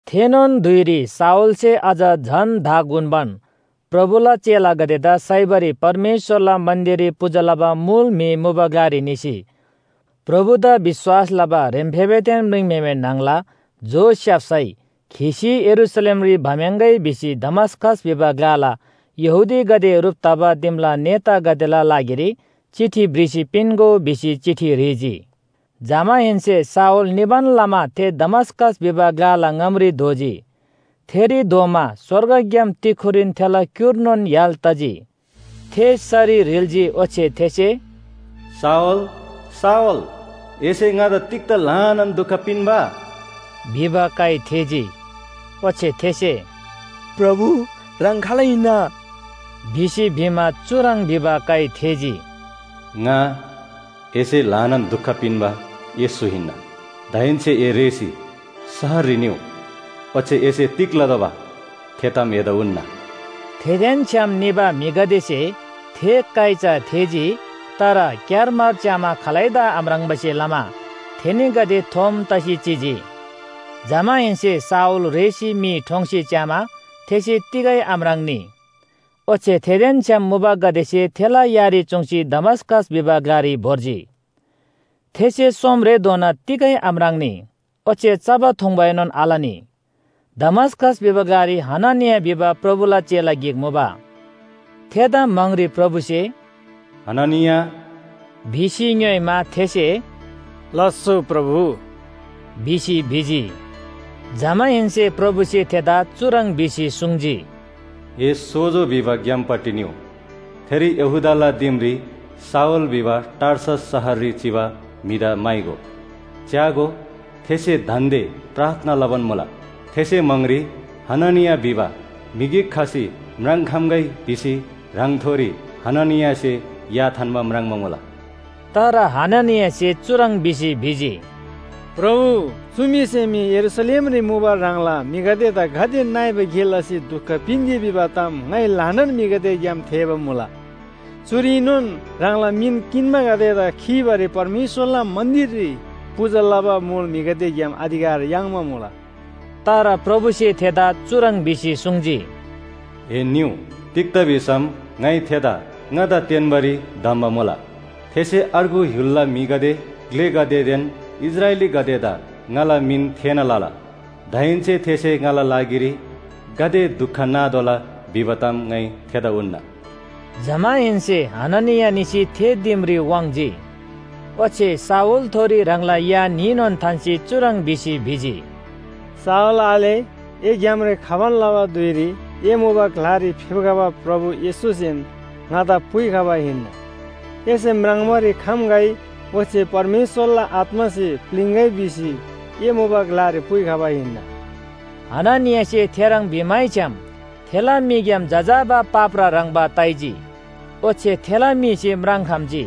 थेनोन धुइरी शाऊलसे अझ धाग उन्‍बान प्रभुला चेलागदेदा साइबारी परमेश्‍वरला मन्‍दिररी पूजा लबा मुल म्‍हि मुबा ग्‍लारी निसी, प्रभुदा विश्‍वास लबा ह्रेम्‍फेबेदेन म्रिङम्‍हेमे न्‍हङला जो स्‍याप्‍सै खीसी यरूशलेमरी भम्‍याङ्‌गै भिसी दमस्‍कस भिबा ग्‍लाला यहूदीगदे ह्रुप तबा दिमला नेतागदेला लागिरी चिठी भ्रिसी पिन्‍गो भिसी चिठी ह्रीजी। जमाहेन्‍से शाऊल निबान लमा थे दमस्‍कस भिबा ग्‍लाला ङामरी धोजी। थेरी धोमा स्‍वर्गग्‍याम तिक्‍खुरीन थेला क्‍युर्नोन य्‍हाल तजी। थे सरी ह्रिल्‍जी ओच्‍छे थेसे “शाऊल, शाऊल, एसे ङादा तिग्‍दा ल्‍हानान दुख पिन्‍बा?” भिबा काइ थेःजी। ओच्‍छे थेसे “प्रभु ह्राङ खाल हिन्‍ना?” भिसी भिमा चुह्रङ् भिबा काइ थेःजी, “ङा एसे ल्‍हानान दुख पिन्‍बा येशू हिन्‍ना। दाहेन्‍से ए रेःसी शहररी निउ, ओच्‍छे एसे तिग लतोःबा थे ताम एदा उन्‍ना।” थेदेन छ्‌याम निबा म्‍हिगदेसे थे काइ चा थेःजी, तर क्‍यारमार च्‍यामा खालैदा आम्राङ्‌बासे लमा थेनीगदे थोम तसी चिजी। जमाहेन्‍से शाऊल रेःसी मी ठोङ्सी च्‍यामा थेसे तिगै आम्राङ्‌नी, ओच्‍छे थेदेन छ्‌याम मुबागदेसे थेला यारी चुङ्सी दमस्‍कस भिबा ग्‍लारी भोर्जी। थेसे सोमरेधोना तिगै आम्राङ्‌नी, ओच्‍छे चबा थुङ्‌बाएनोन आलनी। दमस्‍कस भिबा ग्‍लारी हननिया भिबा प्रभुला चेला गिक मुबा। थेदा म्‍हाङरी प्रभुसे “हननिया” भिसी ङ्‌योइमा, थेसे “लास्‍सो प्रभु” भिसी भिजी। जमाहेन्‍से प्रभुसे थेदा चुह्रङ् भिसी सुङ्जी, “ए ‘सोजो’ भिबा ग्‍यामपट्टि निउ, थेरी यहूदाला दिमरी शाऊल भिबा टार्सस शहररी चिबा म्‍हिदा म्‍हाइगो, च्‍यागो, थेसे दान्‍दे प्रार्थना लबान मुला। थेसे म्‍हाङरी हननिया भिबा म्‍हि गिक खसी म्राङ्‌खम्‍गै भिसी ह्राङथोरी हननियासे या थान्‍बा म्राङ्बा मुला।” तर हननियासे चुह्रङ् भिसी भिजी, “प्रभु, चु म्‍हिसे मी यरूशलेमरी मुबा ह्राङला म्‍हिगदेदा गाते नइबा गे लसी दुख पिन्‍जी भिबा ताम ङाइ ल्‍हानान म्‍हिगदेग्‍याम थेःबा मुला। चुरीनोन ह्राङला मिन किन्‍बागदेदा खीबारी परमेश्‍वरला मन्‍दिररी पूजा लबा मुल म्‍हिगदेग्‍याम अधिकार याङ्बा मुला।” तर प्रभुसे थेदा चुह्रङ् भिसी सुङ्जी, “ए निउ, तिग्‍दा भिसम ङाइ थेदा ङादा तेन्‍बारी धम्‍बा मुला। थेसे अर्गु य्‍हुलला म्‍हिगदे, ग्‍लेगदेदेन इस्राएलीगदेदा ङाला मिन थेःना लला। दाहेन्‍से थेसे ङाला लागिरी गाते दुख नातोःला भिबा ताम ङाइ थेदा उन्‍ना।” जमाहेन्‍से हननिया निसी थे दिमरी वाङ्‌जी। ओच्‍छे शाऊलथोरी ह्राङला या न्‍हीनोन थान्‍सी चुह्रङ् भिसी भिजी, “शाऊल आले, ए ग्‍यामरी खबान लबा धुइरी ए मुबा ग्‍लारी फेप्‍खबा प्रभु येशूसेन ङादा पुइखबा हिन्‍ना। एसे म्राङ्बारी खम्‍गै ओच्‍छे परमेश्‍वरला आत्‍मासे प्‍लिङ्‌गै भिसी ए मुबा ग्‍लारी पुइखबा हिन्‍ना।” हननियासे थेह्रङ् भिमैछ्‌याम थेला मीग्‍याम जजाबा पाप्रा ह्रङ्‌बा ताइजी ओच्‍छे थेला मीसे म्राङ्‌खम्‍जी।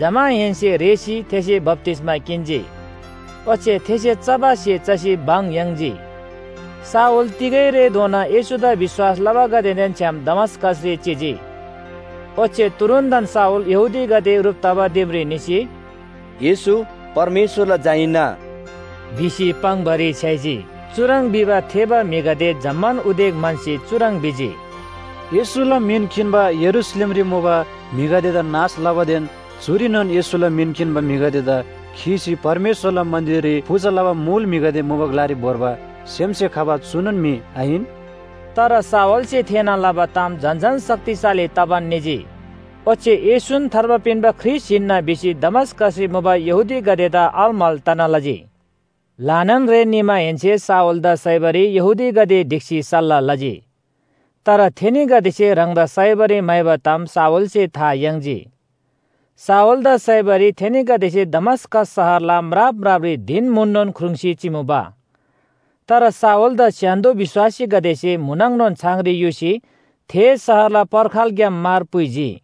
जमाहेन्‍से रेःसी थेसे बप्‍तिस्‍मा किन्‍जी। ओच्‍छे थेसे चबा स्‍हे चसी भङ याङ्जी। शाऊल तिगै रेधोना येशूदा विश्‍वास लबागदेदेन छ्‌याम दमस्‍कसरी चिजी। ओच्‍छे तुरुन्‍तन शाऊल यहूदीगदे ह्रुप तबा दिमरी निसी, “येशू परमेश्‍वरला झा हिन्‍ना” भिसी पाङ्‌बारी छ्‌याइजी। चुह्रङ् भिबा थेःबा म्‍हिगदे जम्‍मान उदेक म्‍हन्‍सी चुह्रङ् भिजी, “येशूला मिन किन्‍बा यरूशलेमरी मुबा म्‍हिगदेदा नाश लबादेन चुरीनोन येशूला मिन किन्‍बा म्‍हिगदेदा खीसी परमेश्‍वरला मन्‍दिररी पूजा लबा मुल म्‍हिगदे मुबा ग्‍लारी भोर्बा सेमसे खबा चुनोन म्‍हि आहिन?” तर शाऊलसे थेःना लबा ताम झन झन शक्तिशाली तबान निजी ओच्‍छे येशून थार्बा पिन्‍बा ख्रीष्‍ट हिन्‍ना भिसी दमस्‍कसरी मुबा यहूदीगदेदा अलमल तना लजी। ल्‍हानान रे निमाहेन्‍से शाऊलदा साइबारी यहूदीगदे ढिक्‍सी सल्‍लाह लजी। तर थेनीगदेसे ह्राङदा साइबारी म्‍हाइबा ताम शाऊलसे था याङ्जी। शाऊलदा साइबारी थेनीगदेसे दमस्‍कस शहरला म्राप म्रापरी धिन म्‍हुननोन ख्रुङ्‌सी चिमुबा। तर शाऊलदा स्‍य्‍हान्‍दो विश्‍वासीगदेसे म्‍हुनङनोन छाङरी युसी थे शहरला पर्खालग्‍याम मार पुइजी।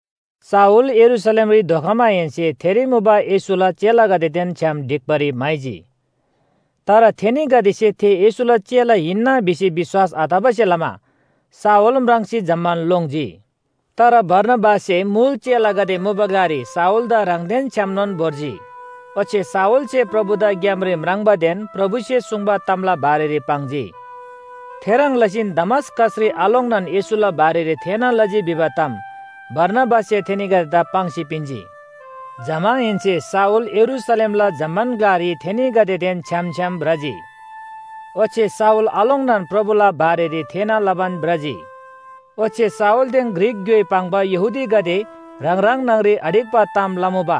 शाऊल यरूशलेमरी खमाहेन्‍से थेरी मुबा येशूला चेलागदेदेन छ्‌याम ढिक्‍बारी म्‍हाइजी। तर थेनीगदेसे थे येशूला चेला हिन्‍ना भिसी विश्‍वास आतबासे लमा शाऊल म्राङ्सी जम्‍मान लोङ्जी। तर बारनाबाससे मुल चेलागदे मुबा ग्‍लारी शाऊलदा ह्राङदेन छ्‌यामनोन भोर्जी। ओच्‍छे शाऊलसे प्रभुदा ग्‍यामरी म्राङ्बादेन प्रभुसे सुङ्बा तामला बारेरी पाङ्जी। थेह्रङ् लसीन दमस्‍कसरी आलोङ्नान येशूला बारेरी थेःना लजी भिबा ताम बारनाबाससे थेनीगदेदा पाङ्सी पिन्‍जी। जमाहेन्‍से शाऊल यरूशलेमला जम्‍मान ग्‍लारी थेनीगदेदेन छ्‌याम छ्‌याम भ्रजी, ओच्‍छे शाऊल आलोङ्नान प्रभुला बारेरी थेःना लबान भ्रजी। ओच्‍छे शाऊलदेन ग्रीक ग्‍योइ पाङ्बा यहूदीगदे ह्राङ ह्राङ न्‍हङरी आढिक्‍बा ताम लमुबा,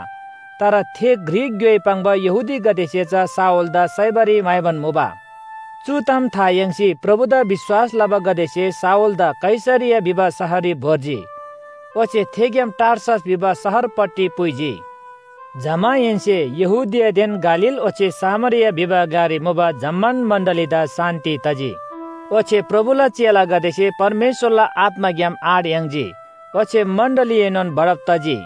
तर थे ग्रीक ग्‍योइ पाङ्बा यहूदीगदेसे चा शाऊलदा साइबारी म्‍हाइबान मुबा। चु ताम था याङ्सी प्रभुदा विश्‍वास लबागदेसे शाऊलदा कैसरिया भिबा शहररी भोर्जी, ओच्‍छे थेग्‍याम टार्सस भिबा शहरपट्टि पुइजी। जमाहेन्‍से यहूदियादेन गालील ओच्‍छे सामरिया भिबा ग्‍लारी मुबा जम्‍मान मण्‍डलीदा शान्‍ति तजी। ओच्‍छे प्रभुला चेलागदेसे परमेश्‍वरला आत्‍माग्‍याम आँट याङ्जी ओच्‍छे मण्‍डलीएनोन बढब तजी।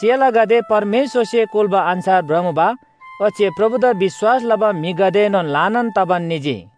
चेलागदे परमेश्‍वरसे कुल्‍बा अन्‍छार भ्रमुबा ओच्‍छे प्रभुदा विश्‍वास लबा म्‍हिगदेएनोन ल्‍हानान तबान निजी।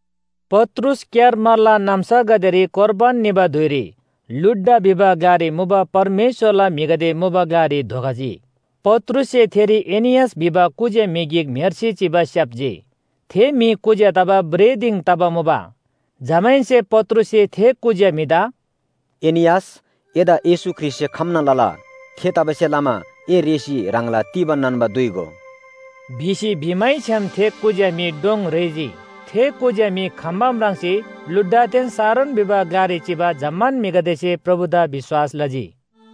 पत्रुस क्‍यारमारला नाम्‍सागदेरी कोर्बान निबा धुइरी लुड्डा भिबा ग्‍लारी मुबा परमेश्‍वरला म्‍हिगदे मुबा ग्‍लारी धोखजी। पत्रुससे थेरी एनियास भिबा कुज्‍या म्‍हि गिक म्‍हेर्सी चिबा स्‍याप्‍जी, थे म्‍हि कुज्‍या तबा भ्रेः दिङ तबा मुबा। जमाहेन्‍से पत्रुससे थे कुज्‍या म्‍हिदा “एनियास, एदा येशू ख्रीष्‍टसे खम्‍ना लला। थेतबासेलमा ए रेःसी ह्राङला तीबा नान्‍बा दुइगो” भिसी भिमैछ्‌याम थे कुज्‍या म्‍हि डोङ रेःजी। थे कुज्‍या म्‍हि खम्‍बा म्राङ्सी लुड्डादेन शारोन भिबा ग्‍लारी चिबा जम्‍मान म्‍हिगदेसे प्रभुदा विश्‍वास लजी।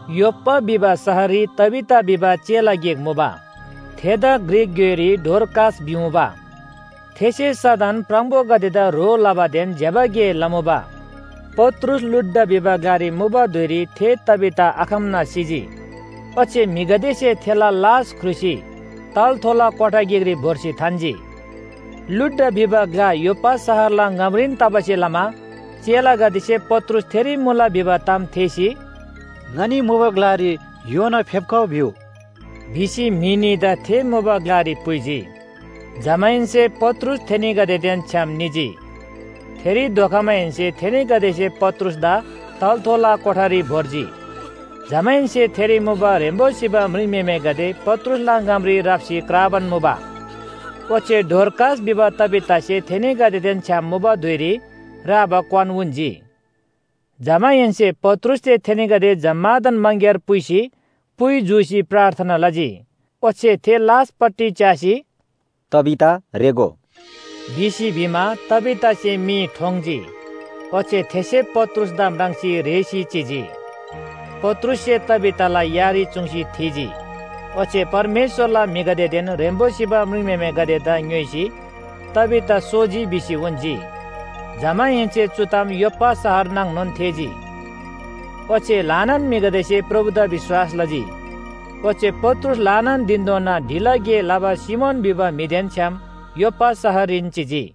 योप्‍पा भिबा शहररी तबीता भिबा चेला गिक मुबा, थेदा ग्रीक ग्‍योइरी डोरकास भिमुबा। थेसे सदन प्राङबोगदेदा ह्रो लबादेन ज्‍यबा गे लमुबा। पत्रुस लुड्डा भिबा ग्‍लारी मुबा धुइरी थे तबीता आखम्‍ना सिजी, ओच्‍छे म्‍हिगदेसे थेला लास ख्रुसी तलाथोला कोठा गिकरी भोर्सी थान्‍जी। लुड्डा भिबा ग्‍ला योप्‍पा शहरला ङामरीन तबासे लमा चेलागदेसे पत्रुस थेरी मुला भिबा ताम थेःसी, “ङनी मुबा ग्‍लारी योना फेप्‍खउ भिउ” भिसी म्‍हि न्‍हीदा थे मुबा ग्‍लारी पुइजी। जमाहेन्‍से पत्रुस थेनीगदेदेन छ्‌याम निजी। थेरी धोखमाहेन्‍से थेनीगदेसे पत्रुसदा तलाथोला कोठारी भोर्जी। जमाहेन्‍से थेरी मुबा ह्रेम्‍बो सिबा म्रिङम्‍हेमेगदे पत्रुसला ङामरी राप्‍सी क्राबान मुबा, ओच्‍छे डोरकास भिबा तबीतासे थेनीगदेदेन छ्‌याम मुबा धुइरी राबा क्‍वान उन्‍जी। जमाहेन्‍से पत्रुससे थेनीगदे जम्‍मादान मङग्‍यार पुइसी पुइ जूसी प्रार्थना लजी, ओच्‍छे थे लासपट्टि च्‍यासी, “तबीता रेःगो” भिसी भिमा, तबीतासे मी ठोङ्‌जी ओच्‍छे थेसे पत्रुसदा म्राङ्सी रेःसी चिजी। पत्रुससे तबीताला यारी चुङ्सी थीजी ओच्‍छे परमेश्‍वरला म्‍हिगदेदेन ह्रेम्‍बो सिबा म्रिङम्‍हेमेगदेदा ङ्‌योइसी तबीता सोजी भिसी उन्‍जी। जमाहेन्‍से चु ताम योप्‍पा शहर नाङनोन थेःजी, ओच्‍छे ल्‍हानान म्‍हिगदेसे प्रभुदा विश्‍वास लजी। ओच्‍छे पत्रुस ल्‍हानान धिनधोना ढिला गे लबा सिमोन भिबा म्‍हिदेन छ्‌याम योप्‍पा शहररीन चिजी।